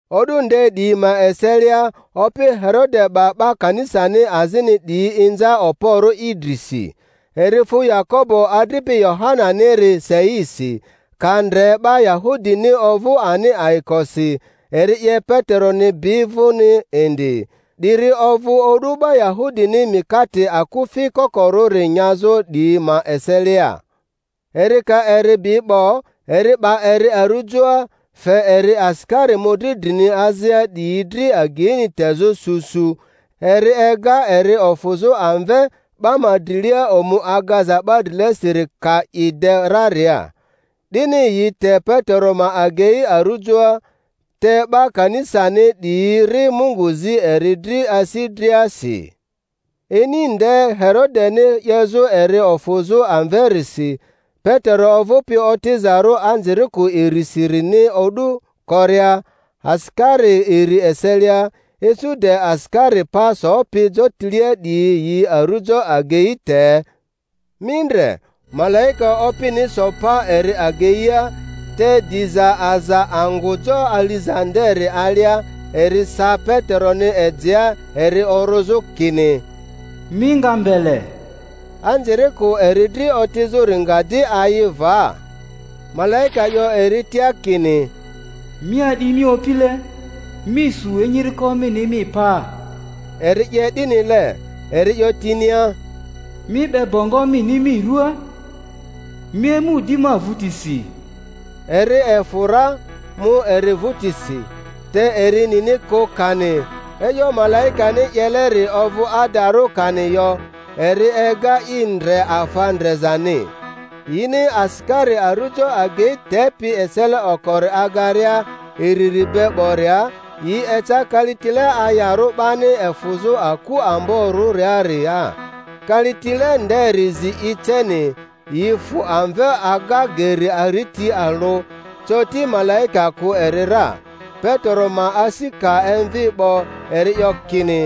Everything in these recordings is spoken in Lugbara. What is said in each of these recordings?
O'du nde 'diyi ma eselia opi Herode 'ba 'ba kanisani azini 'diyi inza okporᴜ i drisi. Eri fu Yakobo adripi Yohananiri seisi; ka ndre 'ba Yahudini ovᴜ ani ayikosi eri 'ye Peteroni bi vᴜni indi. 'Diri ovᴜ o'du 'ba Yahudini mikate akufi kokorᴜri nyazᴜ 'diyi ma eselia. Eri ka eri bi 'bo, eri 'ba eri arujoa, fe eri asikari mᴜdri drini azia 'diyi dri ageini tezᴜ su su; eri ega eri ofᴜzᴜ amve 'ba ma drilia omu Agaza 'ba drilesiri ka i de raria. 'Dini yi te Petero ma agei arujoa; te 'ba kanisani 'diyi ri Mungu zi eri dri asi driasi. Ini nde Herodeni 'yezᴜ eri ofᴜzᴜ amverisi, Petero ovᴜpi otizarᴜ anzirikᴜ irisirini o'du koria asikari iri eselia, isu de asikari pa sopi jotilea 'diyi yi arᴜjo agei te; mi ndre, malaika Opini so pa eri ageia, te diza aza angᴜ jo aliza nderi alia; eri sa Peteroni ejea eri orᴜzᴜ, kini, Mi nga mbele! Anzirikᴜ eri dri otizᴜri nga di ayi va. Malaika 'yo eri tia kini, Mi a'di mi opile, mi su enyiriko mini mi paa. Eri 'ye 'dinile. Eri 'yo tinia, Mi 'be bongo mini mi ruaa, mi emu di ma vᴜtisi. Eri efᴜ ra, mu eri vᴜtisi; te eri nini kᴜ kani e'yo malaikani 'yeleri ovᴜ adarᴜ kani yo, eri ega i ndre afa ndrezani. Yini asikari arujo agei tepi esele okori agaria iriri be 'boria, yi eca kalitile ayarᴜ 'bani efᴜzᴜ aku amborᴜriaria. Kalitile nderi zi i ceni, yi fᴜ amve aga geri ariti alᴜ; coti malaika kᴜ eri ra. Petero ma asi ka emvi 'bo eri 'yo kini,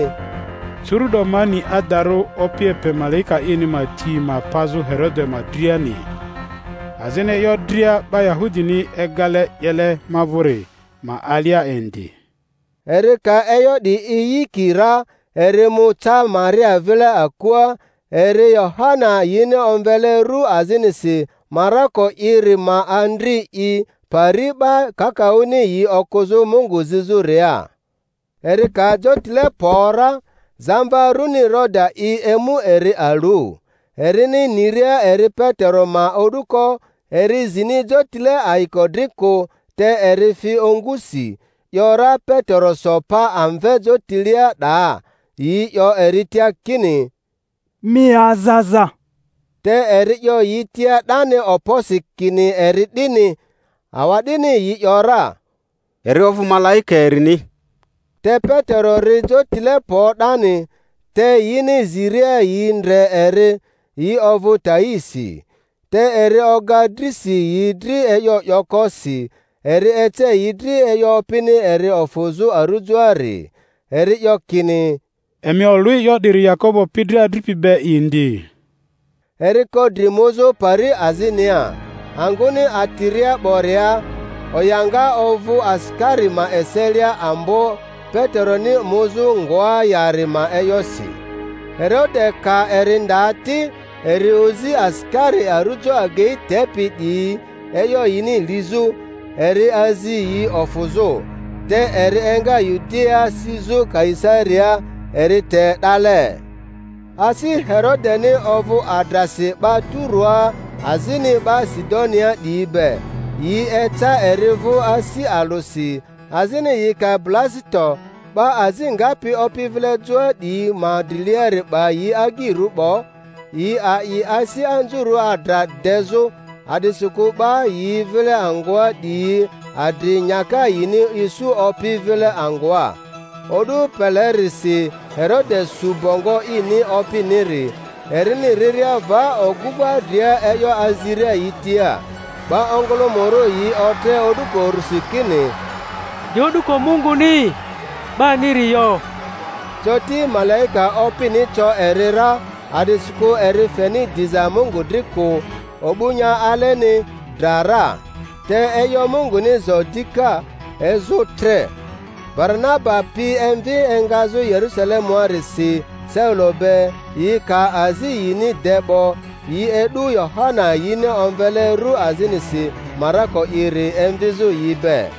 Curu'do ma ni adarᴜ Opi epe malaika ini ma ti ma pazᴜ Herode ma driani, azini e'yo dria 'ba Yahudini egale 'yele ma vᴜri ma alia indi. Eri ka e'yo 'di iyiki ra, eri mu ca Maria vile akua, eri Yohana yini omvele rᴜ azinisi Marako'iri ma andri'i, pari 'ba kakaᴜni yi okᴜzᴜ Mungu zizᴜria. Eri ka jotile kpo ra, zamva runi Roda'i emu eri alu. Erini niria eri Petero ma o'duko, eri zini jotile ayiko dri kᴜ, te eri fi ongusi, 'yo ra Petero so pa amve jotilea 'daa! Yi 'yo eri tia kini, Mi aza aza. Te eri 'yo yi tia 'dani okposi kini eri 'dini. Awa'dini yi ‘yora, Eri ovᴜ malaika erini! Te Petero ri jotile kpo 'dani; te yini ziria yi ndre eri, yi ovᴜ taisi. Te eri oga drisi yi dri e'yo 'yoko si, eri ece yi dri e'yo Opini eri ofᴜzᴜ arᴜjoari. Eri 'yo kini, Emi olᴜ e'yo 'diri Yakobo pi dri adripi be indi. Eri ko dri muzᴜ pari azinia. Angᴜni atiria 'boria, o'yoŋa ovᴜ asikari ma eselia ambo Pete-roni muzᴜ ngoa yari ma e'yosi. Herode ka eri nda ti, eri ozi asikari arujo agei tepi 'diyi e'yo yini lizᴜ, eri azi yi ofuzᴜ. Te eri enga Yudiaa sizᴜ Kaisariaa, eri te 'dale. Asi Herodeni ovᴜ adrasi 'ba Turoa azini 'ba Sidonia 'diyi be; yi eca eri vᴜ asi alᴜsi, azini yi ka Blasito 'ba azi ngapi opi vile joa 'diyi ma driliari 'ba yi agyirᴜ 'bo, yi a'i asi anzurᴜ adra dezᴜ, a'disikᴜ 'ba yi vile angᴜa 'diyi adri nyaka yini isu opi vile angᴜa. O'du pelerisi Herode su bongo ini opiniri, erini riria va ogᴜŋa dria e'yo aziria yi tia. 'Ba ongᴜlᴜmᴜrᴜ yi otre o'duko urusi kini, 'Di o'duko munguni, 'baniri yo! Coti malaika Opini co eri ra, a'disikᴜ eri feni diza Mungu dri kᴜ; o'bu nya aleni, dra ra. Te e'yo Munguni zo dika, ezᴜ tre. Baranaba pi emvi engazᴜ Yerusalemuarisi Saulo be, yi ka azi yini de 'bo; yi e'du Yohana yini omvele ru azinisi Marako'iri emvizᴜ yi be.